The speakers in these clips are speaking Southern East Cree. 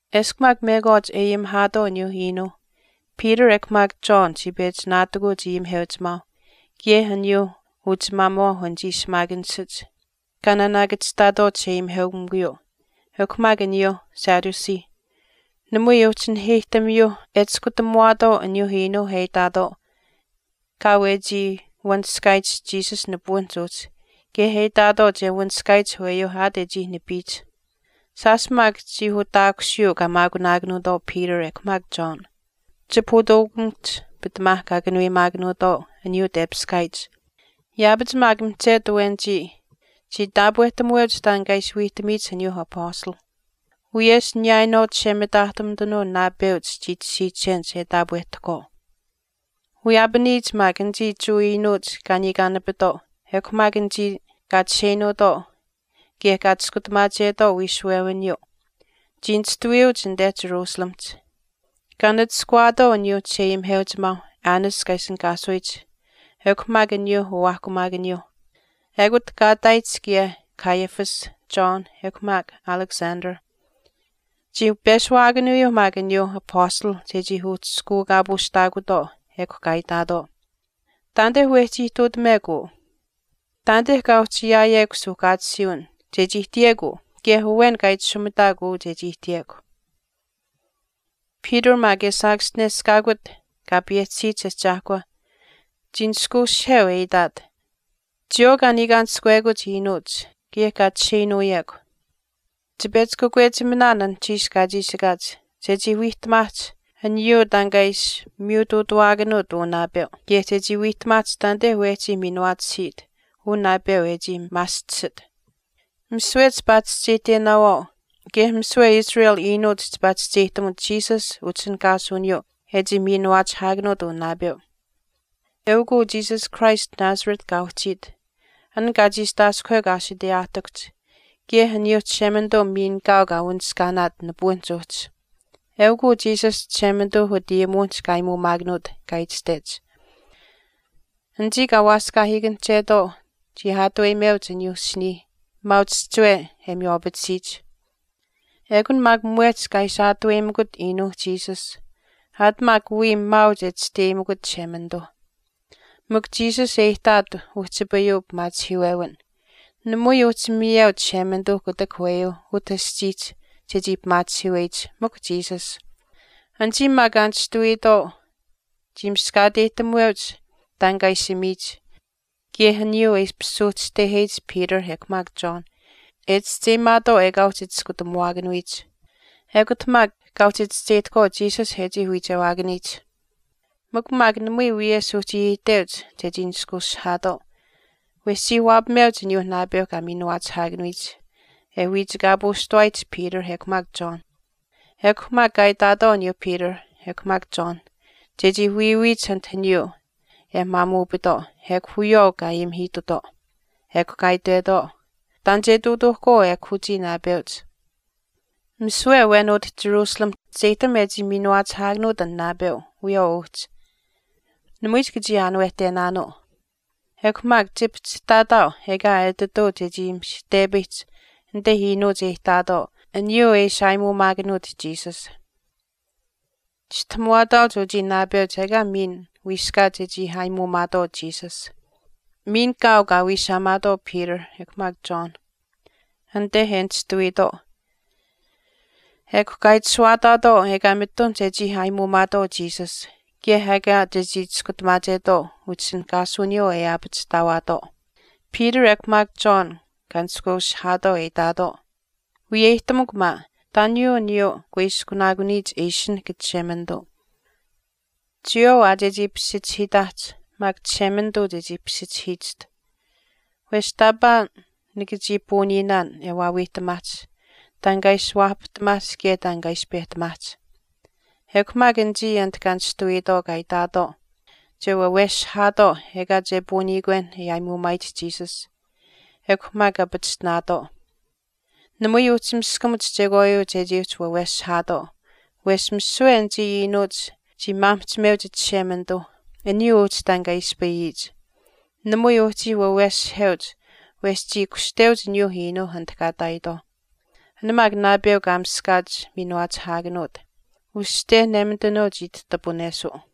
Eshkw maak mekwaach e ayimihaatwaau aniyuuh iinuuh Peter ekw maak John chii pechi naatikuuch ayimiheuchimaauh kaye aniyuu uchimaamuwaauh anichii shimaakanishach kaa naanaakachihtaatwaau chisheayimiheukamikuyuu, ekw maak aniyuuh Sadduceeh. Namui uhchi naheyihtamiyuu e chiskutamuwaatwaau aniyuu iinuu e itaatwaau kaau e chii wanishkaayich Jesus nipuwinihch uhchi kaye e itaatwaau che wanishkaayich aweyuu aat e chii nipiyich. Shaash maak chii utaakushiyuu kaa maakunaakanuutwaau Peter ekw maak John. Chipahutuukamikuhch pitamaa kaa kanuweyimaakanuutwaau aniyuu tepiskaayich. Yaapach maak mihchetu awenichii chii taapwehtamuweuch taan kaa ishi wiihtamiyich aniyuu apastalh. Wiyesh niyaayinwaau chishemitaahtumitanuu naapeuch chii tashiichenich e taapwehtahkwaau. Wiyaapaniyich maak anichii Jewa iinuuch kaa niikaanapitwaau ekw maak anichii kaa chisheinuutwaau kaye kaa chiskutamaachetwaau wiishuwewiniyuu chii nishtuwiyuuch anite Jerusalemihch. Kaa nachishkawaatwaau aniyuuh chisheayimiheuchimaau Annas kaa ishinihkaasuyich ekw maak aniyuuh uwaahkumaakaniyuuh. Ekut kaa ihtaayich kaye Caiaphas, John, ekw maak Alexander. Chii peshuwaakanuuyuu maak aniyuu apastalh chechii uhchishkuukaapuushtaakutwaau ekw kaa itaatwaau, “Taanite wehchii ihtuutamekw uu. Taanite kaa uhchi ayaayekw suuhkaatisiiwin chechii ihtiyekw uu kaye awen kaa itashumitaakw uu chechii ihtiyekw.” Peter maak e saakaschineshkaakut Kaa payehchisiyich Ahchaahkwa, chii nishkweushiheu e itaat, “Chiyawaau kaa niikaanishkawekuch iinuuch, kaye kaa chisheinuuyekw, chipechi kakwechiminaan anuhchiish kaa chiishikaach chechii wiihtamaahch aniyuu taan kaa ishi miyutuutamuwaakanuut uu naapeu kaye chechii wiihtamaahch taanite wehchii miinuwaatisiit uu naapeu e chii maaschisit. Misiwe chipaa chischeyihtenaawaau kaye misiwe Israel iinuuch chipaa chischeyihtamuch Jesus utishinihkaasuwiniyuu e chii miinuwaachihiikut uu naapeu. Eukw uu Jesus Christ Nazareth kaa uhchiit, an kaa chiistaaskuhwekw aashiteyaahtikuhch kaye aniyuu Chishemanituu miin kaau kaa wanishkaanaat nipuwinihch uhchi. Eukw uu Jesus Chishemanituu utayimuwinihch kaa aayimuumaakanuut kaa itashtech, Anichii kaa waaskaahiikanihchetwaau chii aatuweyimeuch aniyuu asinii maauch chihchiwe e miywaapatisiyich. Ekun maak mwehch kaa ishi aatuweyimikut iinuu Jesus aat maak wiya maauch e chisteyimikut Chishemanituu. Mikw Jesus e ihtaat uhchipayuu pimaachihiiwewin. Namui uhchi miyeu Chishemanituu kutak aweyuu utah aschiihch chechii pimaachihiiweyich, mikw Jesus.” Anichii maak kaa nishtuwiitwaau chii miskaateyihtamuweuch taan kaa ishi ayimiyich kaye aniyuu e ishpish suuhchiteheyich Peter ekw maak John e chischeyimaatwaau ekaa uhchi chiskutamuwaakanuyich. Ekut maak kaa uhchi chischeyihtahkwaau Jesus e chii wiichewaakaniyich. Mikw maak namui wiyesh uhchii iteuch chechii nishkuushihaatwaau, wesh chii waapameuch aniyuu naapeuh kaa miinuwaachihaakanuyich e wiichikaapuushtawaayich Peter ekw maak John. Ekw maak kaa itaatwaau aniyuu Peter ekw maak John chechii wiiwiyich anit aniyuu e maamuupitwaau ekw wiyawaau kaa ayimihiitutwaau. Ekw kaa itwetwaau, “Taan che ihtuutuuhkwaau ekw uchii naapeuch. Misiwe awen utah Jerusalemihch chischeyihtam e chii miinuwaachihaakanuut an naapeu wiyawaau uhchi. Namui chika chii aanuwehtenaanuu. Ekw maak chipihchihtaataau ekaa etituu chechii mishihtepayihch anite iinuuch e ihtaatwaau aniyuu e ishi aayimuumaakanuut Jesus. Chistahamuwaataauch uchii naapeuch ekaa miin wiiskaat chechii aayimuumaatwaau Jesus.” Miin kaau kaa wiishaamaatwaau Peter ekw maak John anite e nishtuwiitwaau ekw kaa itashuwaataatwaau ekaa mitun chechii aayimuumaatwaau Jesus kaye ekaa chechii chiskutamaachetwaau utishinihkaasuwiniyuu e aapachihtaawaatwaau. Peter ekw maak John kaa nishkweushihaatwaau e itaatwaau, “Wiyeyihtamukw maa, taaniyuu aniyuu e kuiskunaakuniyich e ishinahk Chishemanituu. Chiyawaau aa chechii pisichihiitaahch maak Chishemanituu chechii pisichihiichiht. Wesh taapaa nika chii puuniinaan e waawiihtamaahch taan kaa ishi waapahtamaahch kaye taan kaa ishi pehtamaahch.” Ekw maak anichii anit kaa nishtuwiitwaau, kaa itaatwaau che waweshihaatwaau ekaa che puuniikwen e aayimuumaayich Jesus ekw maak kaa pachishtinaatwaau. Namui uhchii miskamuch chekwaayuu chechii uhchi waweshihaatwaau wesh misiwe anichii iinuuch chii maamihchimeuch Chishemanituu aniyuu uhchi taan kaa ispayiyich. Namui uhchii waweshiheuch wesh chii kushteuch aniyuu iinuuh anit kaa ihtaayitwaauh. An maak naapeu kaa miskaach miinuwaachihaakanuut, uste nemitanuu chii tahtupuneshuu.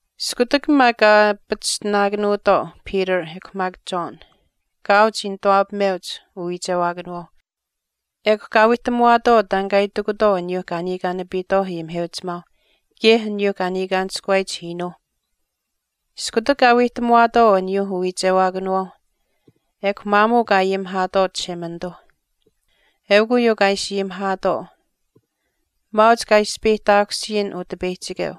Iskutak maak kaa pachishtinaakanuutwaau Peter ekw maak John, kaau chii nituwaapameuch uwiichewaakanawaau ekw kaa wiihtamuwaatwaau taan kaa itikutwaau aniyuu kaa niikaanapiitwaau ayimiheuchimaauh kaye aniyuu kaa niikaanishkuwaayich iinuuh. Iskutak kaa wiihtamuwaatwaau aniyuuh uwiichewaakanawaau ekw maamuu kaa ayimihaatwaau Chishemanituu. Eukw uyuu kaa ishi ayimihaatwaau, “Maauch kaa ispeyihtaakusiyin Utipeyihchikeu,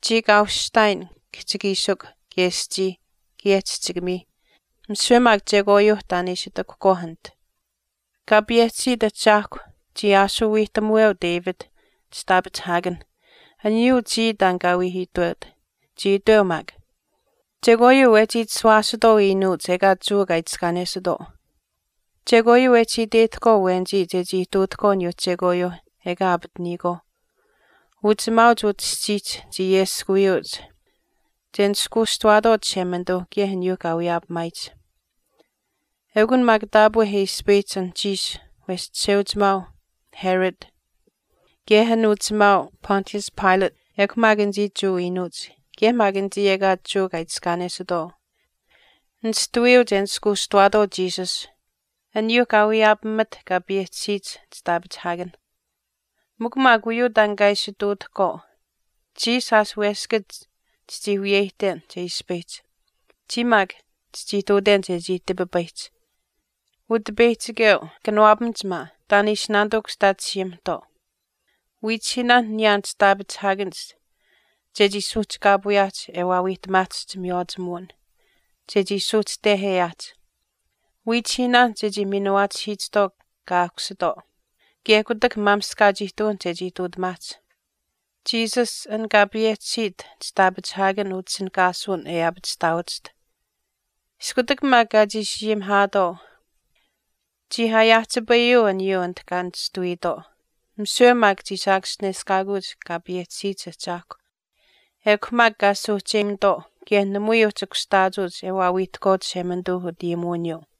chii kaa ushihtaayin kihchikiishikw kaye aschii kaye chihchikamii, misiwe maak chekwaayuu taan e ishi ihtakuhkwaauh anit. Kaa payehchisiit Ahchaahkw chii aashuu wiihtamuweu David, chitaapachihaakanh aniyuu chii taan kaa wii itweut, chii itweu maak, Chekwaayuu wehchii chishuwaasitwaau iinuuch ekaa Jewa kaa itiskaanesitwaau. Chekwaayuu wehchi e iteyihtahkwaau awenichii chechii ihtuutahkwaau aniyuuh chekwaayuuh ekaa aapataniyikwaau. Uchimaauch utah aschiihch chii ayeskuwiyuuch che nishkuushtuwaatwaau Chishemanituu kaye aniyuu kaa wiyaapamaayich. Eukun maak taapwe e ispayihch anuhchiish wesh chisheuchimaau Herod, kaye an uchimaau Pontius Pilate, ekw maak anichii Jewa iinuuch, kaye maak anichii ekaa Jewa kaa itiskaanesitwaau nishtuwiyuuch e nishkuushtuwaatwaau Jesus, aniyuu kaa wiyaapamaat kaa payehchisiyich chitaapachihaakanh. Mikw maak uyuu taan kaa ishi ihtuutahkwaau, chiya shaash weskach chichii wiyeyihten che ispayihch, chiya maak chichii ihtuuten chechii tipipayihch. Utipeyihchikeu, kanawaapamach maa, taan e ishi naanituu kushtaachihiyiimihtwaau. Wiichihiinaan niyaan chitaapachihaakanich chechii suuhchikaapuuyaahch e waawiihtamaahch chimiywaachimuwin, chechii suuhchiteheyaahch. Wiichihiinaan maak chechii miinuwaachihiichihtwaau kaa aahkusitwaau, kaye kutak maamishkaach ihtuwin chechii ihtuutamaahch, Jesus an kaa payehchisiit chitaapachihaakan utishinihkaasuwin e aapachihtaawachiht.” Iskutak maak kaa chiishi ayimihaatwaau, chii aayaahchipayuu aniyuu anit kaa nishtuwiitwaau. Misiwe maak chii saakaschineshkaakuuch Kaa payehchisiyich Ahchaahkwa, ekw maak kaa suuhcheyimutwaau kaye namui uhchi kushtaachuuch e waawiihtahkwaau Chishemanituu utayimuwiniyuu.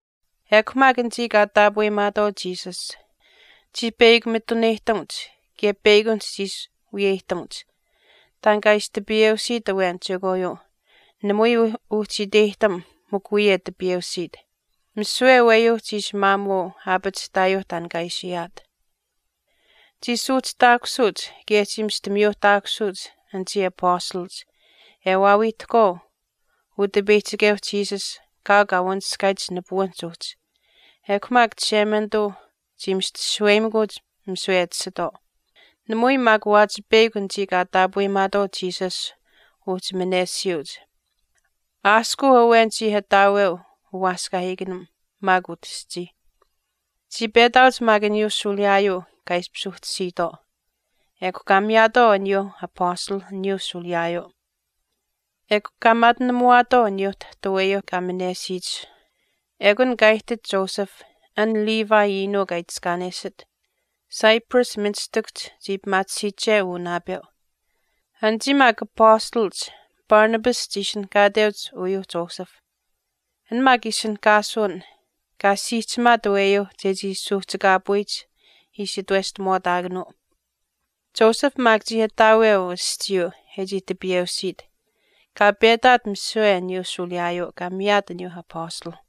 Ekw maak anichii kaa taapweyimaatwaau Jesus, chii peyakw mituneyihtamuch kaye peyakunihch chii ishi wiyeyihtamuch. Taan kaa ishi tipiyeusiit awen chekwaayuu namui uhchi iteyihtam mikw wiya e tipiyeusiit, misiwe aweyuu chii ishi maamuu aapachihtaayuu taan kaa ishi ayaat. Chii suuhchihtaakusuuch kaye chii mista miyuuhtaakusuuch anichii apastalach e waawiihtahkwaau Utipeyihchikeu Jesus kaau kaa wanishkaayich nipuwinihch uhchi, ekw maak Chishemanituu chii mista shaweyimikuuch misiwe e tashitwaau. Namui maak waachi peyakw anichii kaa taapweyimaatwaau Jesus uhchi manesiyuuch. Aaskuu awen chii ataaweu uwaaskaahiikanim maak utaschii. Chii petaauch maak aniyuu shuuliyaayuu kaa ishpish uhchisiitwaau. Ekw kaa miyaatwaau aniyuuh apastalh aniyuu shuuliyaayuu. Ekw kaa maatinamuwaatwaau aniyuu tahtu aweyuu kaa minesiyich. Ekun kaa ihtit Joseph, an Levi iinuu kaa itiskaanesit, Cyprus ministikuhch chii pimaatisiiche uu naapeu. Anichii maak apastalach Barnabas chii ishinihkaateuch uyuu Joseph. An maak ishinihkaasuwin kaa siihchimaat aweyuu chechii suuhchikaapuyich ishi itweshtamuwaataakanuu. Joseph maak chii ataaweu aschiiyuu e chii tipiyeusiit, kaa petaat misiwe aniyuu shuuliyaayuu, kaa miyaat aniyuu Apastalh.